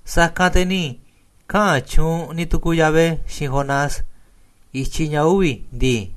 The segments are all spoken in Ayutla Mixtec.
Sa̱kanꞌ te̱ ni̱ kaꞌa̱n tyuunꞌ ni̱ tukuuꞌ Yahvé xiinꞌ Jonás i̱tyiꞌ ña̱ uvi̱ ndii: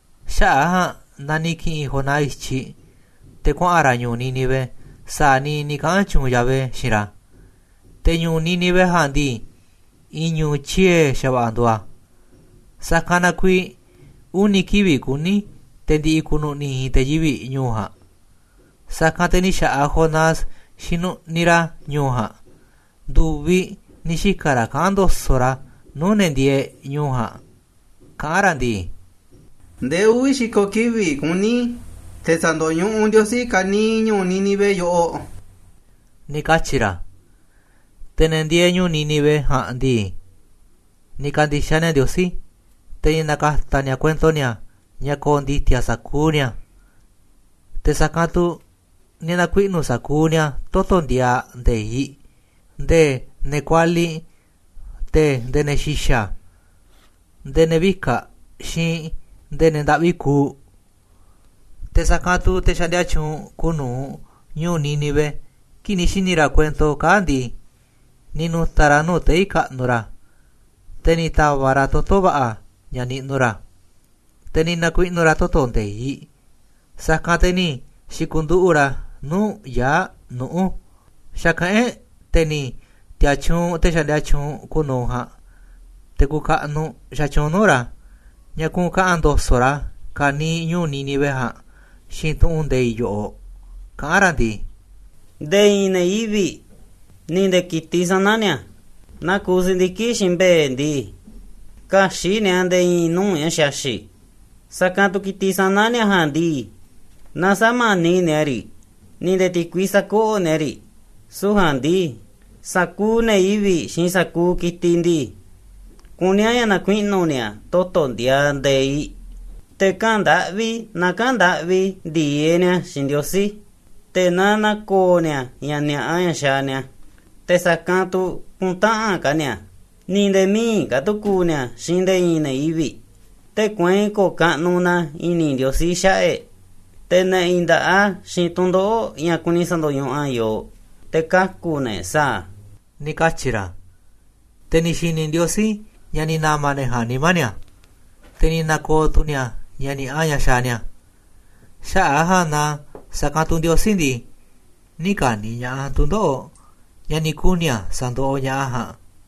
Xaꞌa̱ꞌ a̱ ja̱a̱nꞌ na ni̱ ki̱ꞌi̱n Jonás i̱tyiꞌ te̱ kuaꞌa̱n ra̱ ñu̱u̱ Nínive sa̱a̱ niiꞌ ni̱ kaꞌa̱n tyuunꞌ Yahvé xiinꞌ ra̱. Te̱ ñu̱u̱ Nínive ja̱a̱nꞌ ndii, i̱i̱n ñu̱u̱ tyie̱ xa̱va̱ꞌa̱ nduuꞌ a̱, sa̱kanꞌ na kuiiꞌ uni̱ kivi̱ꞌ kuní te̱ ndi̱ꞌi̱ ku̱nu̱ꞌni̱ i̱i̱n te̱ yivi̱ꞌ ñu̱u̱ ja̱a̱nꞌ. Sa̱kanꞌ te̱ ni̱ xa̱ꞌaꞌ Jonás xinuꞌniꞌ ra̱ ñu̱u̱ ja̱a̱nꞌ, ndu̱viꞌ ni̱ xika̱ ra̱ kaꞌán ndo̱so̱ꞌ ra̱ nuu̱ꞌ ne̱ ndieeꞌ ñu̱u̱ ja̱a̱nꞌ, kaꞌán ra̱ ndii: ―Ndee uvi̱ xi̱ko̱ kivi̱ꞌ kuní te̱ sa̱ndo̱ñuꞌuꞌ Ndiosí ka̱niiꞌ ñu̱u̱ Nínive yoꞌoꞌ ―ni̱ katyi̱ ra̱. Te̱ ne̱ ndieeꞌ ñu̱u̱ Nínive ja̱a̱nꞌ ndii, ni̱ ka̱ndi̱xaꞌ ni̱a̱ Ndiosí, te̱ ni̱ na̱ka̱ta̱ ni̱a̱ kuento ni̱a̱ ña̱ ko̱o̱ ndi̱ti̱a̱ sa̱kuuꞌ ni̱a̱, te̱ sa̱kanꞌ tu̱ ni̱ na̱kuinu̱ sa̱kuuꞌ ni̱a̱ toto̱ ndiaaꞌ nde̱iꞌ, nde̱e̱ ne̱ kualiꞌ te̱ nde̱e̱ ne̱ xi̱xa̱, nde̱e̱ ne̱ vika̱ꞌ xiinꞌ nde̱e̱ ne̱ ndaꞌvi kuuꞌ. Te̱ sa̱kanꞌ tu̱ te̱ xaꞌndia tyuunꞌ kuuꞌ nu̱uꞌ ñu̱u̱ Nínive, kii̱ꞌ ni̱ xi̱ni̱ ra̱ kuento kaa̱ꞌ ndii, ni̱ nu̱ta̱ ra̱ nuu̱ꞌ tei̱ kaꞌnuꞌ ra̱, te̱ ni̱ ta̱va̱ꞌ ra̱ toto̱ va̱ꞌa̱ ña̱ niꞌnuꞌ ra̱, te̱ ni̱ na̱kuiꞌnu̱ ra̱ toto̱ nde̱iꞌ, sa̱kanꞌ te̱ ni̱ xi̱ku̱nduꞌu̱ꞌ ra̱ nuu̱ꞌ yaa̱ꞌ nuꞌu̱. Xa̱kaꞌán e̱ꞌ te̱ ni̱ ti̱a̱tyuunꞌ te̱ xaꞌndia tyuunꞌ kuuꞌ nu̱uꞌ ja̱a̱nꞌ, te̱ kuuꞌ kaꞌnuꞌ xatyuunꞌ nuu̱ꞌ ra̱ ña̱ kuꞌu̱n kaꞌa̱n ndo̱so̱ꞌ ra̱ ka̱niiꞌ ñu̱u̱ Nínive ja̱a̱nꞌ xiinꞌ tu̱ꞌu̱n nde̱iꞌ yoꞌoꞌ, kaꞌán ra̱ ndii: ―Nde̱e̱ i̱i̱n ne̱ yivi̱ꞌ, ni̱ nde̱e̱ ki̱tiꞌ sana̱ ni̱a̱, naa kuuꞌ si̱ndiki̱ꞌ xiinꞌ mbe̱e̱ ndii, kä̱xi̱ꞌ ni̱a̱ nde̱e̱ i̱i̱n nuu̱ꞌ ña̱ xaxi̱ꞌ, sa̱kanꞌ tu̱ ki̱tiꞌ sana̱ ni̱a̱ ja̱a̱nꞌ ndii, naaꞌ sä̱mani̱ꞌ ni̱a̱ riꞌ, ni̱ nde̱e̱ ti̱kui sä̱koꞌoꞌ ni̱a̱ riꞌ. Süu̱ꞌ ja̱a̱nꞌ ndii sa̱kuuꞌ ne̱ yivi̱ꞌ xiinꞌ sa̱kuuꞌ ki̱tiꞌ ndii, kuní a̱ ña̱ na̱kuiꞌnu̱ ni̱a̱ toto̱ ndiaaꞌ nde̱iꞌ, te̱ kaꞌa̱n ndaꞌvi na kaꞌa̱n ndaꞌvi ndi̱e̱eꞌ ni̱a̱ xiinꞌ Ndiosí, te̱ na na̱ko̱o̱ ni̱a̱ ña̱ ni̱a̱ꞌa ña̱ xaaꞌ ni̱a̱, te̱ sa̱kanꞌ tu̱ kü̱nta̱ꞌanꞌ ka̱ ni̱a̱, ni̱ nde̱e̱ mï̱iꞌ ka̱ tu̱ ku̱u̱ ni̱a̱ xiinꞌ nde̱e̱ i̱i̱n ne̱ yivi̱ꞌ. Tee̱ꞌ kueinꞌ ko̱o̱ kaꞌnuꞌ na i̱ni̱ Ndiosí xaꞌa̱ꞌ e̱ꞌ te̱ na̱ꞌi̱n nda̱ꞌa a̱ xiinꞌ tu̱ndoꞌo̱ꞌ ña̱ kuni sa̱ndo̱ñuꞌuꞌ a̱ yooꞌ, te̱ kaku̱ na e̱ꞌ sa̱a̱ a̱ ―ni̱ katyi̱ ra̱. Te̱ ni̱ xi̱ni̱ Ndiosí ña̱ ni̱ na̱ma̱ ne̱ ja̱a̱nꞌ nimá ni̱a̱, te̱ ni̱ na̱ko̱o̱ tu̱ ni̱a̱ ña̱ ni̱a̱ꞌa ña̱ xaaꞌ ni̱a̱. Xaꞌa̱ꞌ a̱ ja̱a̱nꞌ na, sa̱kanꞌ tu̱ Ndiosí ndii, nï̱ ka̱ni̱ ña̱ꞌaꞌ a̱ tu̱ndoꞌo̱ꞌ ña̱ ni̱ kuni̱ a̱ sa̱ndoꞌoꞌ ña̱ꞌaꞌ a̱ ja̱a̱nꞌ.